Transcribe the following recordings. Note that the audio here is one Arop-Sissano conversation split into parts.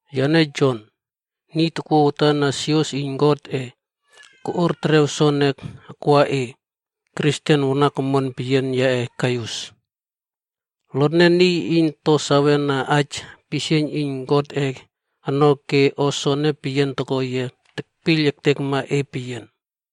Yane Jon, niy takwua watan na sios iyn Godꞌe, koꞌuar terew soene akwa e, Kristen wanak omon peyianma yaꞌe Gaius. Lotne niy iyn to sawena aij aipisieiyn iyn Godꞌe ono ke o soene peyian toko yia tekpiyl ektekma e peyian.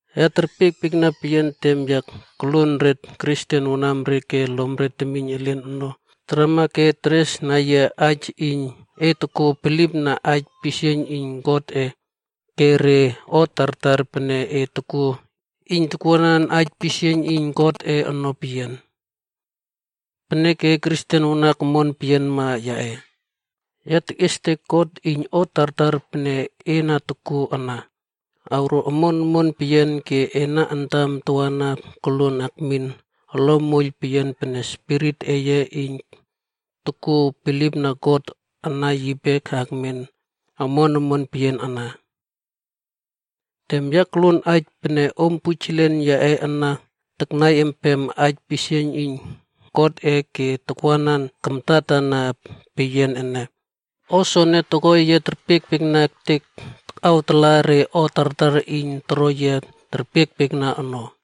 Ya terpiekpiekna peyian tem ya tokluon re Kristen wanamre ke lomre temiyn elen ono tarama ke teresna yia aij iyn e tokuo bilipna aij pisieiyn iyn Godꞌe, ke re o tartar pene e tokuo iyn takwuanan aij pisieiyn iyn Godꞌe ono peyian. Peneke, Kristen wanak omon peyianma yaꞌe, ya tekꞌiestek God iyn o tartar pene e na tokuo ana, awro omon omon peyian ke ena antam tawana koluon akmin olom moiyl peyian pene spirit eye iyn tokuo bilipna God ana yipe akmen omon omon peyian ana. Tem ya koluon aij pene om pujelen yaꞌe ana taknai empem aij pisieiyn iyn Godꞌe ke takwanan kamtatana peyian ene, o soene toko yia terpiekpiekna ektek takꞌawtalaꞌa re o tartar iyn toro yia terpiekpiekna ono.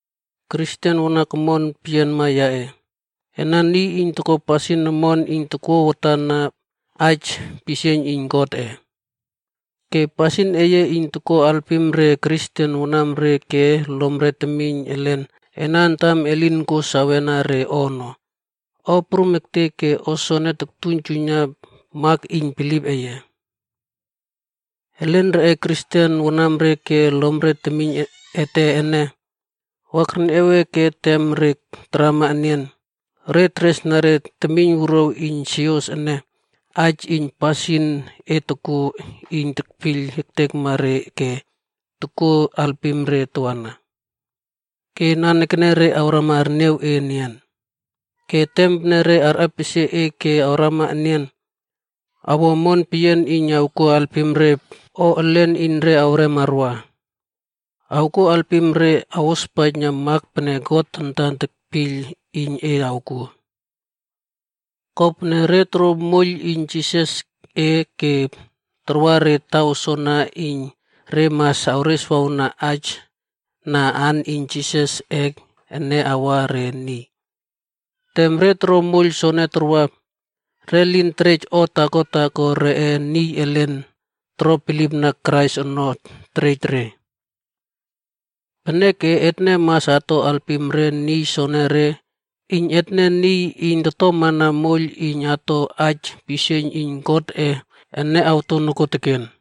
Kristen wanak omon peyianma yaꞌe, ena niy iyn tokuo pasin omon iyn tokwuanan aij pisieiyn iyn Godꞌe. Ke pasin eye iyn tokuo alpim re Kristen wanamre ke lomre temiyn elen ena antam elin kuo sawena re ono, o prum ektek ke o soene toktuiynjuiyna mak iyn bilip eye. Elen reꞌe Kristen wanamre ke lomre temiyn ete ene, wa kerniaw e ke tem re tarama enian, re teresna re temiynwuruaw iyn sios ene, aij iyn pasin e tokuo iyn tekpiyl ektekma re ke tokuo alpim re tawana. Ke nanekene re awrama arniaw e enian. Ke tem pene re arꞌepesie e ke arwa enian, awo omon peyian iyn awkuo alpim re o elen iyn re awrem arwa. Awkuo alpim re awospaijna mak pene God antan tekpiyl iyn e awkuo. Kopene, re torouw moiyl iyn Jisasꞌe ke tarwa re taw soana iyn re mas awreswawna aij na aan iyn Jisasꞌe ene awa re niy. Tem re toro moiyl soene tarwa, re lin terej o taako taako reꞌe niy elin toro bilipna Krais ono terej re. Peneke etne mas ato alpim re niy soenere iyn etne niy iyn totomana moiyl iyn ato aij pisieiyn iyn Godꞌe ene awto nokuoteken.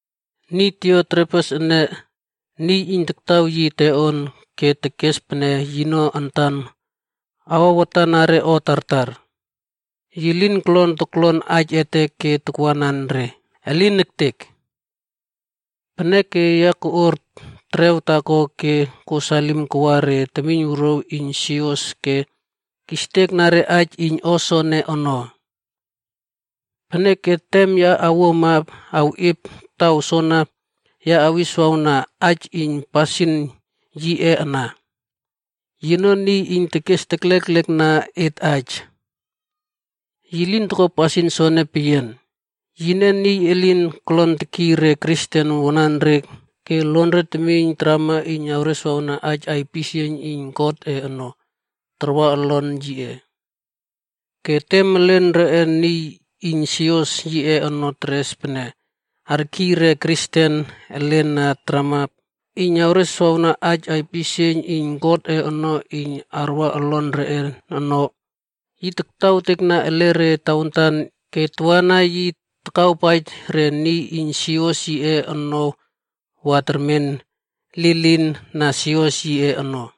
Niy Diotrefes ene, niy iyn taktaw yi teꞌon ke tekes pene yino antan awa watana re o tartar. Yi lin kolon toklon aij ete ke takwanan re. Elin ektek! Peneke ya koꞌuar terew taako ke kuo salim kawa re temiynwuruaw iyn sios ke kistekna re aij iyn o soene ono. Peneke tem ya awuama awꞌiep taw soana, ya awiswawna aij iyn pasin yiꞌe ana. Yino niy iyn tekes tekleklekna et aij. Yi lin toko pasin soene peyian, yine niy elin kolon tekiy re Kristen wananre ke lonre temiyn tarama iyn awreswawna aij aipisieiyn iyn Godꞌe ono, tarwa olon yiꞌe. Ke tem elen reꞌe niy iyn sios yiꞌe ono teres pene arkiy re Kristen elen na tarama iyn awreswawna aij aipisieiyn iyn Godꞌe ono iyn arwa olon reꞌe ono, yi taktawtekna ele re tawantan ke tawana yi takawpaij re niy iyn sios yiꞌe ono wa termen lilin na sios yiꞌe ono.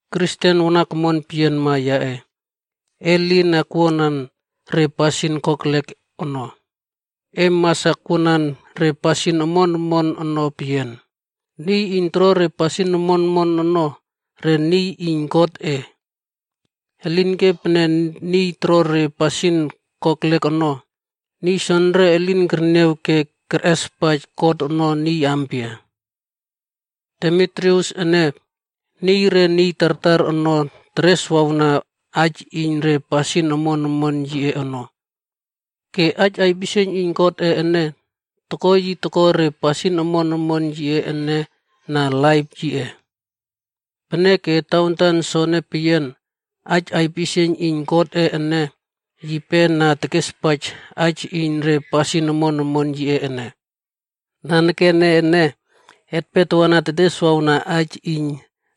Kristen wanak omon peyianma yaꞌe, e lin akwuanan re pasin kokelek ono. E mas akwuanan re pasin omon omon ono peyian. Niy iyn toro re pasin omon omon ono, re niy iyn Godꞌe. Elinke pene niy toro re pasin kokelek ono, niy soenere elin kerniaw ke kerꞌespaij God ono niy aampia. Demitrius ene, niy re niy tartar ono tereswawna aij iyn re pasin omon omon yiꞌe ono. Ke aij aipisieiyn iyn Godꞌe ene, toko yi toko re pasin omon omon yiꞌe ene na laip yiꞌe. Peneke tawantan soene peyian, aij aipisieiyn iyn Godꞌe ene, yipe na tekespaij aij iyn re pasin omon omon yiꞌe ene. Nanekene ene, etpe tawana teteswawna aij iyn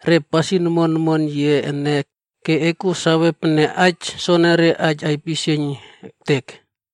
re pasin omon omon yiꞌe ene ke e kuo sawe pene aij soenere aij aipisieiyn ektek.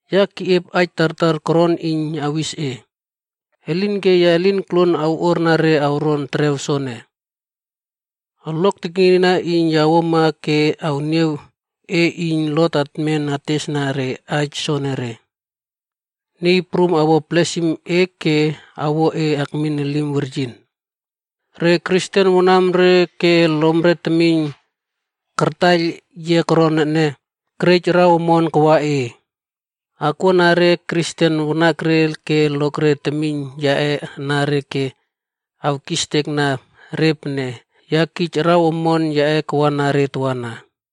Ya keꞌiep aij tartar koron iyn awis e. Elinke ya lin koluon awꞌuarna re awron terew soene. Olok teknieyna iyn ya awuama ke awniaw e iyn lot atmen atestesna re aij soenere. Niy Prum awo blesim e ke awo e akmin elim weryin. Re Kristen wanamre ke lomre temiyn kartaiyl yia koron ene, kerej araw omon reꞌe kawa e. Akwuana re Kristen wanakre ke lokre temiyn yaꞌe anare ke awkistekna re pene ya kij araw omon yaꞌe kawana re tawana.